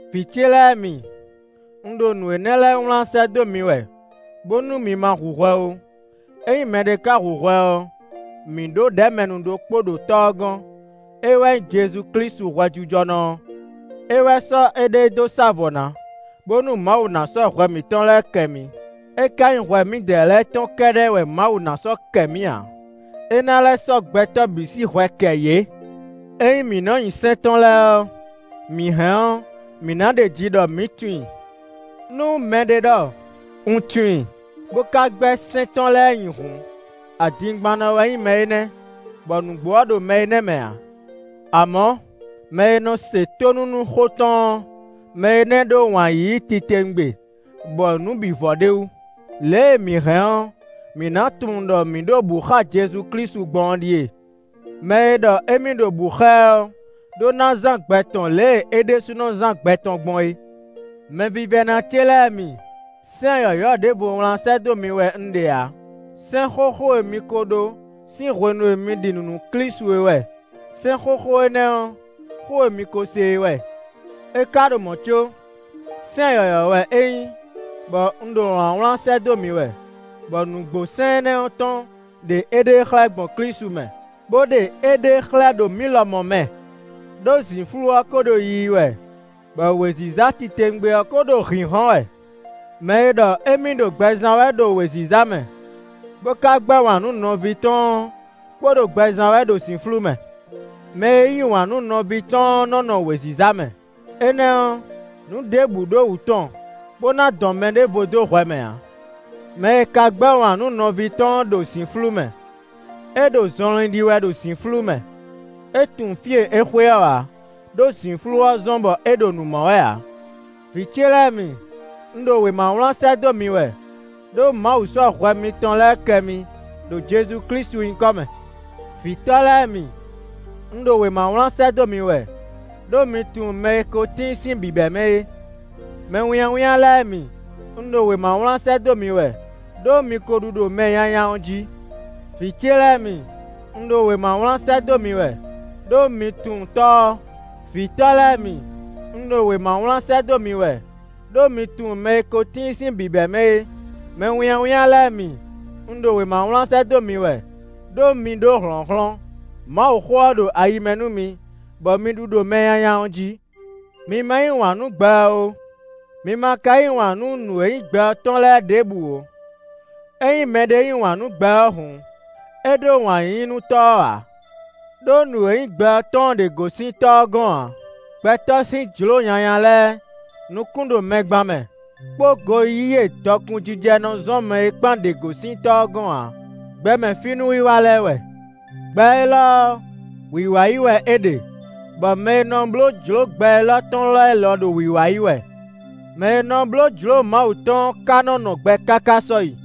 Vǐ ce lɛ́ɛ mi, un ɖo nǔ énɛ́ lɛ́ɛ wlán sɛ́ dó mi wɛ, bónú mi ma hu hwɛ ó. Ényí mɛɖé ka hu hwɛ ɔ́, mǐ ɖǒ ɖɛ̌mɛnu ɖokpó ɖo Tɔ́ ɔ́ gɔ́n; é wɛ nyí Jezu Klísu hwɛjijɔnɔ ɔ́. É wɛ sɔ́ éɖée dó sá vɔ̌ ná, bónú Mawu ná sɔ́ hwɛ mǐtɔn lɛ́ɛ kɛ mǐ. É ká nyí hwɛ mǐdɛɛ lɛ́ɛ tɔn kɛ́ɖɛ́ wɛ Mawu ná sɔ́ kɛ mǐ ǎ; é ná lɛ́ sɔ́ gbɛtɔ́ bǐ sín hwɛ kɛ yě. Ényí mǐ nɔ nyi sɛ́n tɔn lɛ́ɛ ɔ́, mǐ hɛn ɔ́, mǐ nǎ ɖeji ɖɔ mǐ tunwun i. Nú mɛɖé ɖɔ: “Un tunwun i”, bó ka gbɛ́ sɛ́n tɔn lɛ́ɛ nyi hǔn, adingbannɔ wɛ nyí mɛ énɛ́, bɔ nǔgbó ɔ́ ɖo mɛ énɛ́ mɛ ǎ. Amɔ̌, mɛ e nɔ se tónú nú xó tɔn ɔ́, mɛ énɛ́ ɖó wǎn yíyí titewungbe bɔ nǔ bǐ vɔ ɖ'é wú. Lě e mǐ hɛn ɔ́, mǐ nǎ tunwun ɖɔ mǐ ɖo bǔ xá Jezu Klísu gbɔn ɔ́ ɖíe: mɛ e ɖɔ émí ɖo bǔ xá ɛ ɔ́ ɖó ná zán gbɛ tɔn lě e é ɖésúnɔ zán gbɛ tɔn gbɔn é. Mɛvívɛ́ná ce lɛ́ɛ mi, sɛ́n yɔ̌yɔ́ ɖěvo wlán sɛ́ dó mi wɛ un ɖe ǎ; sɛ́n xóxó e mi ko ɖó sín hwenu e mi ɖi nǔ nú Klísu é wɛ. Sɛ́n xóxó énɛ́ ɔ́, xó e mi ko se é wɛ. É ka ɖo mɔ̌ có, sɛ́n yɔ̌yɔ́ wɛ é nyí, bɔ un ɖo wlǎnwlán sɛ́ dó mi wɛ, bɔ nǔgbó sɛ́n énɛ́ tɔn ɖe éɖée xlɛ́ gbɔn Klísu mɛ, bó ɖe éɖée xlɛ́ ɖo mǐ lɔmɔ̌ mɛ, ɖó zǐnflú ɔ́ ko ɖo yiyi wɛ, bɔ wěziza titewungbe ɔ́ ko ɖo hǐnhɔ́n wɛ. Mɛ e ɖɔ émí ɖo gbɛ zán wɛ ɖo wěziza mɛ, bó ka gbɛ́ wǎn nú nɔví tɔn ɔ́ kpo ɖo gbɛ zán wɛ ɖo zǐnflú mɛ. Mɛ e yí wǎn nú nɔví tɔn ɔ́ nɔ́ nɔ wěziza mɛ; énɛ́ ɔ́, nǔ ɖěbǔ ɖo wǔ tɔn bó ná dɔn mɛ ɖěvo dó hwɛ mɛ ǎ. Mɛ e ka gbɛ́ wǎn nú nɔví tɔn ɔ́ ɖo zǐnflú mɛ; é ɖo zɔnlin ɖi wɛ ɖo zǐnflú mɛ; é tunwun fí e é xwe ɔ́ ǎ, ɖó zǐnflú ɔ́ zɔ́n bɔ é ɖo nǔ mɔ wɛ ǎ. Vǐ ce lɛ́ɛ mi, un ɖo wěma wlán sɛ́ dó mi wɛ, ɖó Mawu sɔ́ hwɛ mitɔn lɛ́ɛ kɛ mi ɖo Jezu Klísu nyíkɔ mɛ. Vǐtɔ́ lɛ́ɛ mi, un ɖo wěma wlán sɛ́ dó mi wɛ, ɖó mi tunwun mɛ e ko tíin sín bǐbɛ́mɛ é. Mɛwínnyáwínnyá lɛ́ɛ mi, un ɖo wěma wlán sɛ́ dó mi wɛ, ɖó mi ko ɖu ɖo mɛ nyanya ɔ́ jí. Vǐ ce lɛ́ɛ mi, un ɖo wěma wlán sɛ́ dó mi wɛ, ɖó mi tunwun Tɔ́ ɔ́. Vǐtɔ́ lɛ́ɛ mi, un ɖo wěma wlán sɛ́ dó mi wɛ, ɖó mi tunwun mɛ e ko tíin sín bǐbɛ́mɛ é. Mɛwínnyáwínnyá lɛ́ɛ mi, un ɖo wěma wlán sɛ́ dó mi wɛ ɖó mi ɖó hlɔ̌nhlɔ́n; Mawuxó ɔ́ ɖo ayi mɛ nú mi, bɔ mi ɖu ɖo mɛ nyanya ɔ́ jí. Mi ma yí wǎn nú gbɛ ɔ́ ó; mi ma ka yí wǎn nú nǔ e nyí gbɛ ɔ́ tɔn lɛ́ɛ ɖěbǔ ó. Ényí mɛɖé yí wǎn nú gbɛ ɔ́ hǔn, é ɖó wǎn yíyí nú Tɔ́ ɔ́ ǎ. Đó nǔ e nyí gbɛ ɔ́ tɔn ɔ́ ɖě gosín Tɔ́ ɔ́ gɔ́n ǎ; gbɛtɔ́ sín jlǒ nyanya lɛ́ɛ, nukún ɖo mɛ gban mɛ, kpó goyíyí e dɔkun jijɛ nɔ zɔ́n mɛ é kpán ɖě gosín Tɔ́ ɔ́ gɔ́n ǎ; gbɛmɛ fí núwiwa lɛ́ɛ wɛ. Gbɛ élɔ́ ɔ́, wǐwá yi wɛ é ɖe, bɔ mɛ e nɔ bló jlǒ gbɛ élɔ́ tɔn lɛ́ɛ lɔ ɖo wǐwá yi wɛ; mɛ e nɔ bló jlǒ Mawu tɔn ɔ́ ka nɔ́ nɔ gbɛ káká sɔ́yi.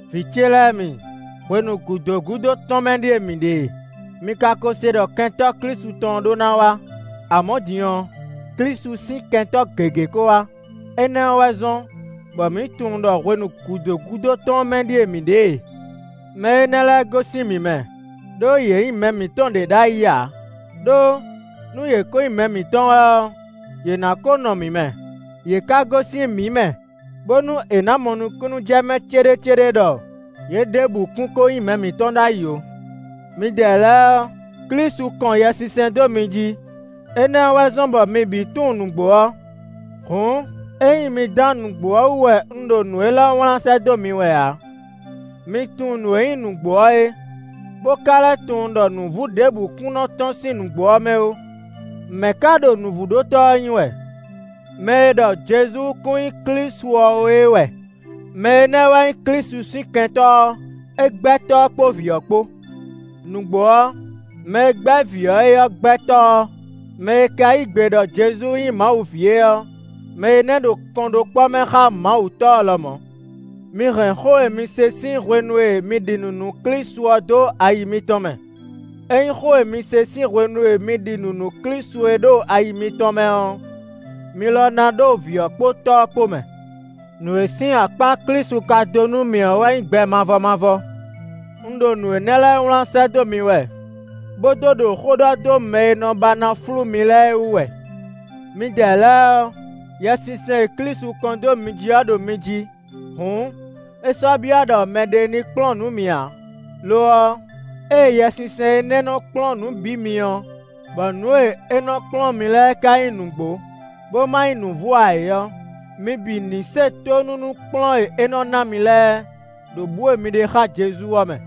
Vǐ ce lɛ́ɛ mi, hwenu gǔdo gúdo tɔn mɛ ɖíe mǐ ɖe e; mi ka ko se ɖɔ kɛntɔ́ Klísu tɔn ɔ́ ɖó ná wá; amɔ̌ din ɔ́, Klísu sín kɛntɔ́ gěgé ko wá. Énɛ́ ɔ́ wɛ zɔ́n bɔ mǐ tunwun ɖɔ hwenu gǔdo gúdo tɔn ɔ́ mɛ ɖíe mǐ ɖe e. Mɛ énɛ́ lɛ́ɛ gosín mǐ mɛ, ɖó yě nyí mɛ mǐtɔn ɖě ɖ'ayǐ ǎ; ɖó nú yě ko nyí mɛ mǐtɔn wɛ ɔ́, yě ná ko nɔ mǐ mɛ; yě ka gosín mǐ mɛ, bónú è nǎ mɔ nukúnnú jɛ mɛ céɖécéɖé ɖɔ yě ɖěbǔ kún ko nyí mɛ mǐtɔn ɖ'ayǐ ó. Midɛɛ lɛ́ɛ ɔ́, Klísu kɔn Yɛsinsɛn dó mi jí; énɛ́ ɔ́ wɛ zɔ́n bɔ mi bǐ tunwun nǔgbó ɔ́. Hǔn, ényí mi dán nǔgbó ɔ́ wú wɛ un ɖo nǔ élɔ́ wlán sɛ́ dó mi wɛ ǎ. Mi tunwun nǔ e nyí nǔgbó ɔ́ é, bó ka lɛ́ tunwun ɖɔ nǔvú ɖěbǔ kún nɔ tɔ́n sín nǔgbó ɔ́ mɛ ó. Mɛ̌ ka ɖo nǔvúɖótɔ́ ɔ́ nyí wɛ? Mɛ e ɖɔ Jezu kún nyí Klísu ɔ́ ó é wɛ; mɛ énɛ́ wɛ nyí Klísu sín Kɛntɔ́ ɔ́. É gbɛ́ Tɔ́ ɔ́ kpó Vǐ ɔ́ kpó. Nǔgbó ɔ́, mɛ e gbɛ́ Vǐ ɔ́ é ɔ́ gbɛ́ Tɔ́ ɔ́. Mɛ e ka yí gbe ɖɔ Jezu nyí Mawu ví é ɔ́, mɛ énɛ́ ɖo kɔnɖókpɔ́ mɛ xá Mawu Tɔ́ ɔ́ lɔmɔ̌. Mi hɛn xó e mi se sín hwenu e mi ɖi nǔ nú Klísu ɔ́ dó ayi mitɔn mɛ. Ényí xó e mi se sín hwenu e mi ɖi nǔ nú Klísu é ɖo ayi mitɔn mɛ ɔ́, mi lɔ ná ɖo vǐ ɔ́ kpó Tɔ́ ɔ́ kpó mɛ. Nǔ e sín akpá Klísu ka dó nú mǐ ɔ́ wɛ nyí gbɛ mavɔ mavɔ. Un ɖo nǔ énɛ́ lɛ́ɛ wlán sɛ́ dó mi wɛ, bó dó ɖo xó ɖɔ dó mɛ e nɔ ba ná flú mi lɛ́ɛ wú wɛ. Midɛɛ lɛ́ɛ ɔ́, Yɛsinsɛn e Klísu kɔn dó mi jí ɔ́ ɖo mi jí; hǔn, é sɔ́ byɔ́ ɖɔ mɛɖé ní kplɔ́n nǔ mi ǎ. Lo ɔ́, ée Yɛsinsɛn énɛ́ nɔ kplɔ́n nǔ bǐ mi ɔ́, bɔ nǔ e é nɔ kplɔ́n mi lɛ́ɛ ka nyí nǔgbó, bó ma nyí nǔvú ǎ é ɔ́, mi bǐ ní se tónú nú kplɔ́n e é nɔ ná mi lɛ́ɛ, ɖo bǔ e mi ɖe xá Jezu ɔ́ mɛ.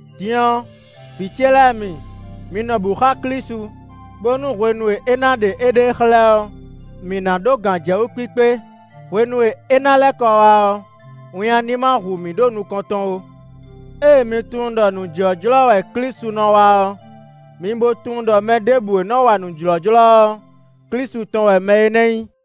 Din ɔ́, vǐ ce lɛ́ɛ mi, mi nɔ bǔ xá Klísu, bónú hwenu e é ná ɖe éɖée xlɛ́ ɔ́, mǐ ná ɖó gǎnjɛwú kpíkpé; hwenu e é ná lɛ́ kɔ wá ɔ́, winnyá ní ma hu mǐ ɖo nukɔn tɔn ó. Ée mi tunwun ɖɔ nǔ jlɔ́jlɔ́ wɛ Klísu nɔ wa ɔ́, mi bo tunwun ɖɔ mɛ ɖěbǔ e nɔ wa nǔ jlɔ́jlɔ́ ɔ́, Klísu tɔn wɛ mɛ énɛ́ nyí.